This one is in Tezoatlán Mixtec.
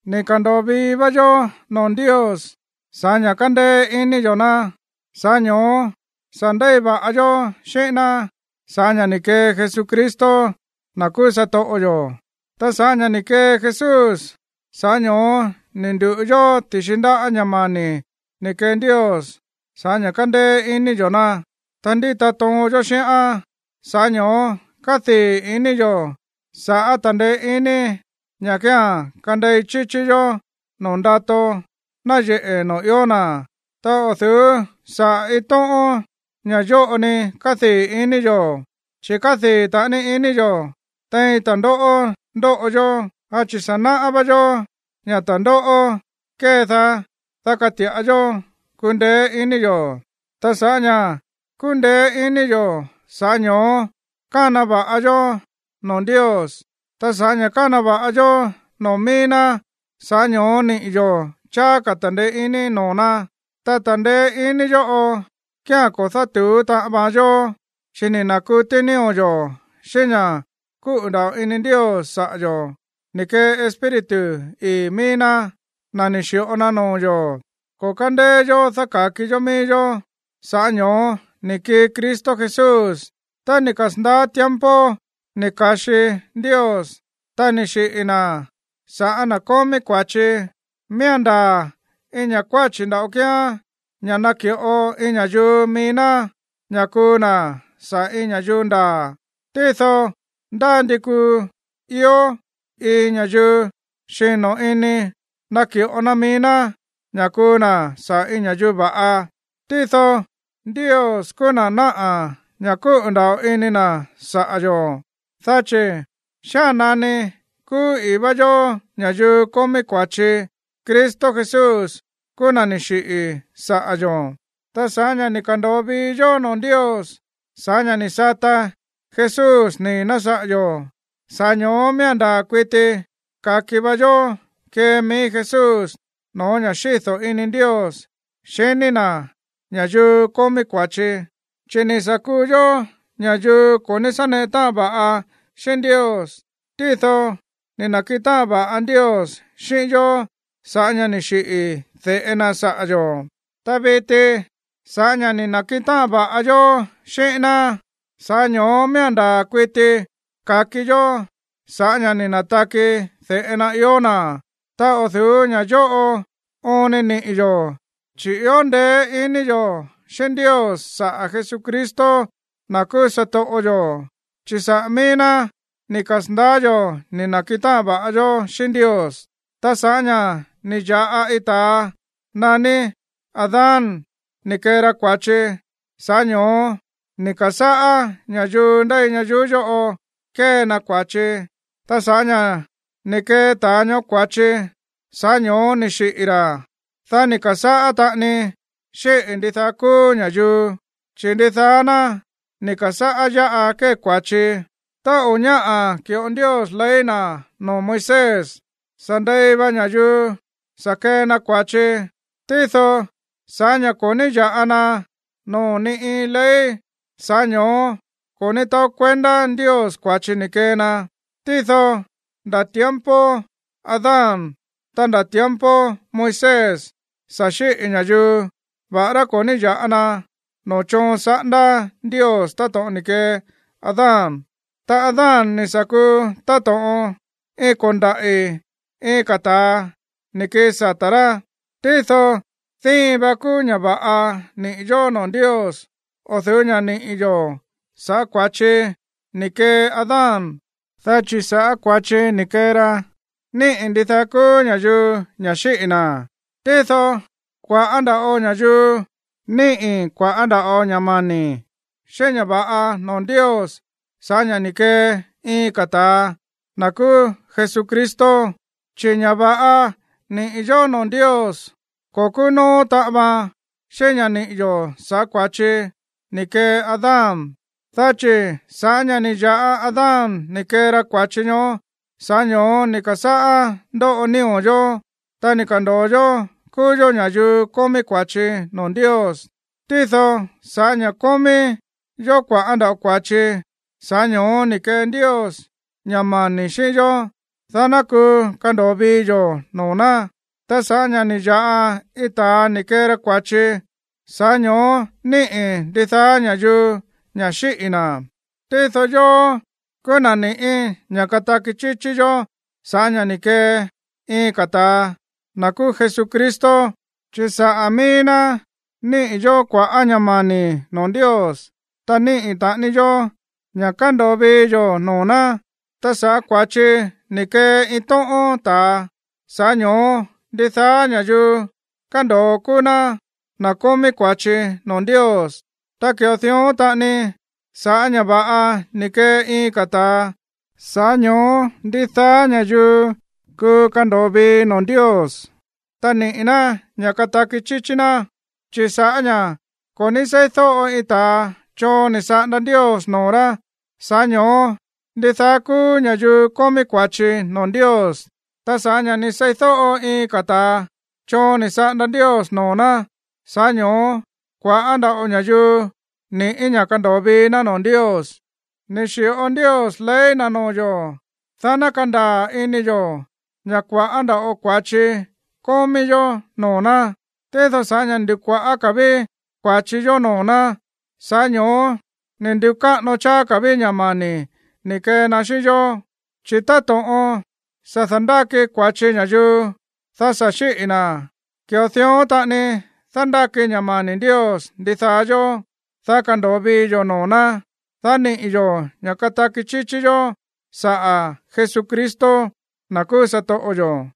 Ni̱ ka̱ndo̱o vii vá yó noo̱ Ndios sa̱ꞌá ña̱ kándéé iní yo̱ ná, sa̱ꞌá ño̱ó sa̱ ndéi va̱ꞌa yó xíꞌín ná sa̱ꞌá ña̱ ni̱ kee Jesucristo, na̱ kúú satoꞌo yo̱. Ta sa̱ꞌá ña̱ ni̱ kee Jesús, sa̱ꞌá ño̱ó ni̱ ndu̱ꞌu yó ti̱xi ndáꞌa̱ ña̱ mani̱ ni̱ kee Ndios sa̱ꞌá ña̱ kándéé iní yo̱ ná, ta ndíta toon yó xíꞌán. Sa̱ꞌá ño̱ó kádii̱ iní yo̱ sa̱ꞌá ta̱ndeé iní ña̱ kía̱n kandei chíchí yó noo̱ ndato náyeꞌe̱ noo̱ ió na̱. Ta o̱ du̱ú saꞌa̱ iin tóꞌón ña̱ yóꞌo ni kádii̱ iní yo̱, chi̱ kádii̱ taꞌani iní yo̱ tein ta̱ndóꞌó ndóꞌo yó, dá chi̱ sa̱ náꞌá vá yó ña̱ ta̱ndóꞌó kédaá, dá kati̱ꞌa yó kundeé ini yo̱. Ta sa̱ꞌá ña̱ kúndeé ini yo̱, sa̱ꞌá ño̱ó kána va̱ꞌa yó noo̱ Ndios, ta sa̱ꞌá ña̱ kána va̱ꞌa yó noo̱ mií ná, sa̱ꞌá ño̱ó niꞌi̱ yo̱ cháá ka̱ ta̱ndeé iní noo̱ ná. Ta ta̱ndeé iní yóꞌo kía̱n ko̱ dátu̱ú taꞌan vaan yó, chi̱ ni̱ na̱kutí nío̱ yo̱ xíꞌín ña̱ kúꞌu̱ nda̱ꞌo ini Ndios saꞌa̱ yo̱ ni̱ kee Espíritu ii̱ mií ná, na̱ ni̱ xi̱ꞌo na noo̱ yo̱. Ko̱ kándeé yó dáka̱ki yó mií yó, sa̱ꞌá ño̱ó ni̱ kii Cristo Jesús tá ni̱ kasa̱ndaá tiempo ni̱ ka̱xi Ndios, ta ni̱ xiꞌi̱ na̱ sa̱ꞌá na̱ kómí kua̱chi. Miía̱n ndaa̱ iin ña̱ kuáchi̱ nda̱ꞌo kíán ña̱ naki̱ꞌo iin ña̱yuu mií ná ña̱ kuu na̱ saꞌa̱ iin ña̱yuu ndaa̱. Tído ndá ndi kuu ió iin ña̱yuu xino̱ ini naki̱ꞌo na mií ná ña̱ kuu na̱ saꞌa̱ iin ña̱yuu va̱ꞌa. Tído Ndios kúú na̱ náꞌa̱ ña̱ kúꞌu̱ nda̱ꞌo ini na̱ saꞌa̱ yo̱, dá chi̱ xía̱n nani kúú ii̱ vá yó ña̱yuu kómí kua̱chi, Cristo Jesús kúú na̱ ni̱ xiꞌi̱ saꞌa̱ yo̱. Ta sa̱ꞌá ña̱ ni̱ ka̱ndo̱o vii yo̱ noo̱ Ndios sa̱ꞌá ña̱ ni̱ sata Jesús nii̱ ná saꞌa̱ yo̱, sa̱ꞌá ño̱ó miía̱n ndaa̱ kuiti ka̱ki va yó kee mií Jesús no̱ó ña̱ xído̱ ini Ndios xiní na̱ ña̱yuu kómí kua̱chi. Chi̱ ni̱ sa̱ kuu yó ña̱yuu ko̱ ní sá neꞌe táꞌan va̱ꞌa xíꞌín Ndios, tído ni̱ na̱kiꞌin táꞌan va̱ꞌa Ndios xíꞌín yó sa̱ꞌá ña̱ ni̱ xiꞌi̱ de̱ꞌe na saꞌa̱ yo̱. Ta viti sa̱ꞌá ña̱ ni̱ na̱kiꞌin táꞌan va̱ꞌa yó xíꞌín ná, sa̱ꞌá ño̱ó miía̱n ndaa̱ kuiti ka̱ki yó sa̱ꞌá ña̱ ni̱ na̱taki de̱ꞌe na ió na̱. Ta o̱ du̱ú ña̱ yóꞌo oon ni niꞌi̱ yo̱, chi̱ ió ndeé ini yo̱ xíꞌín Ndios saꞌa̱ Jesucristo, na̱ kúú satoꞌo yo̱, chi̱ saꞌa̱ mií ná ni̱ kasa̱ndaá yo̱ ni̱ na̱kiꞌin táꞌan va̱ꞌa yó xíꞌín Ndios. Ta sa̱ꞌá ña̱ ni̱ ya̱ꞌa iin ta̱a naní Adán ni̱ kee ra kua̱chi, sa̱ꞌá ño̱ó ni̱ ka̱sáꞌá ña̱yuu ndéi ñayuú yóꞌo kée na kua̱chi. Ta sa̱ꞌá ña̱ ni̱ kee ta̱a ñoó kua̱chi, sa̱ꞌá ño̱ó ni̱ xiꞌi̱ ra̱. Dá ni̱ ka̱sáꞌá taꞌani xíꞌi̱ ndidaá kúú ña̱yuu, chi̱ ndidaá ná ni̱ ka̱sáꞌá yáꞌa kée kua̱chi. Tá o̱ ñáꞌa̱ ki̱ꞌo Ndios ley na̱ noo̱ Moisés, sa̱ ndei va ña̱yuu sa̱ kee na kua̱chi. Tído sa̱ꞌá ña̱ ko̱ ní ya̱ꞌa na noo̱ ni iin ley, sa̱ꞌá ño̱ó ko̱ ní taó kuendá Ndios kua̱chi ni̱ kee na. Tído nda̱ tiempo Adán, ta nda̱ tiempo Moisés sa̱ xíꞌi̱ ña̱yuu, va̱ꞌará ko̱ ní ya̱ꞌa na noo̱ choon saꞌándá Ndios táto̱ꞌon ni̱ kee Adán. Ta Adán ni̱ sa̱ kuu táto̱ꞌon iin ko̱ndaꞌi̱ iin ka̱ ta̱a ni̱ kii sata̱ rá. Tído díin va kúú ña̱ va̱ꞌa níꞌi̱ yó noo̱ Ndios o̱ du̱ú ña̱ níꞌi̱ yo̱ sa̱ꞌá kua̱chi ni̱ kee Adán. Dá chi̱ sa̱ꞌá kua̱chi ni̱ kee ra, níꞌi̱ ndidaá kúú ña̱yuu ña̱ xíꞌi̱ na̱. Tído kua̱ꞌá nda̱ꞌo ña̱yuu níꞌi̱ kua̱ꞌá nda̱ꞌo ña̱ mani̱ xíꞌín ña̱ va̱ꞌa noo̱ Ndios sa̱ꞌá ña̱ ni̱ kee iin ka̱ ta̱a, na̱ kúú Jesucristo. Chi̱ ña̱ va̱ꞌa níꞌi̱ yó noo̱ Ndios, ko̱ kúú nóó taꞌan vaan xíꞌín ña̱ níꞌi̱ yo̱ sa̱ꞌá kua̱chi ni̱ kee Adán. Dá chi̱ sa̱ꞌá ña̱ ni̱ ya̱ꞌa Adán ni̱ kee ra kua̱chi ñoó, sa̱ꞌá ño̱ó ni̱ ka̱sáꞌá ndóꞌo nío̱ yo̱, ta ni̱ ka̱ndo̱o yó kúú yó ña̱yuu kómí kua̱chi noo̱ Ndios. Tído sa̱ꞌá ña̱ kómí yó kua̱ꞌá nda̱ꞌo kua̱chi, sa̱ꞌá ño̱ó ni̱ kee Ndios ña̱ mani̱ xíꞌín yó, dá ná kuu kando̱o vii yo̱ noo̱ ná. Ta sa̱ꞌá ña̱ ni̱ ya̱ꞌa iin ta̱a ni̱ kee ra kua̱chi, sa̱ꞌá ño̱ó níꞌi̱ ndidaá ña̱yuu ña̱ xíꞌi̱ na̱. Tído yóó kúú na̱ ni̱ꞌí ña̱ kataki chíchí yó sa̱ꞌá ña̱ ni̱ kee iin ka̱ ta̱a, na̱ kúú Jesucristo, chi̱ saꞌa̱ míí ná níꞌi̱ yó kua̱ꞌá ña̱ mani̱ noo̱ Ndios, ta níꞌi̱ taꞌani yó ña̱ kándo̱o vii yo̱ noo̱ ná. Ta sa̱ꞌá kua̱chi ni̱ kee iin tóꞌón ta̱a, sa̱ꞌá ño̱ó ndidaá ña̱yuu kándo̱o kúú ná na̱ kómí kua̱chi noo̱ Ndios. Ta ki̱ꞌo dión taꞌani sa̱ꞌá ña̱ va̱ꞌa ni̱ kee iin ka̱ ta̱a, sa̱ꞌá ño̱ó ndidaá ña̱yuu kuu kando̱o vii noo̱ Ndios, ta niꞌi̱ ná ña̱ kataki chíchí ná. Chi̱ sa̱ꞌá ña̱ ko̱ ní seídóꞌo iin ta̱a choon ni̱ saꞌanda Ndios noo̱ rá, sa̱ꞌá ño̱ó ndidaá kúú ña̱yuu kómí kua̱chi noo̱ Ndios. Ta sa̱ꞌá ña̱ ni̱ seídóꞌo iin ka̱ ta̱a choon ni̱ saꞌanda Ndios noo̱ ná, sa̱ꞌá ño̱ó kua̱ꞌá nda̱ꞌo ña̱yuu ni̱ꞌí ña̱ kando̱o vii ná noo̱ Ndios. Ni̱ xi̱ꞌo Ndios ley na̱ noo̱ yo̱, dá ná kandaa̱ ini yo̱ ña̱ kua̱ꞌá nda̱ꞌo kua̱chi kómí yó noo̱ ná. Tído sa̱ꞌá ña̱ ni̱ ndu̱kuaꞌa̱ ka̱ ví kua̱chi yo̱ noo̱ ná, sa̱ꞌá ño̱ó ni̱ ndu̱káꞌano cháá ka̱ ví ña̱ mani̱ ni̱ kee na xíꞌín yó. Chi̱ táto̱ꞌon sa̱ da̱ndáki kua̱chi ña̱yuu, dá sa̱ xíꞌi̱ na̱, ki̱ꞌo dión taꞌani dándáki ña̱ mani̱ Ndios ndidaá yó, dá kando̱o vii yo̱ noo̱ ná, dá niꞌi̱ yo̱ ña̱ kataki chíchí yó saꞌa̱ Jesucristo, na̱ kúú satoꞌo yo̱.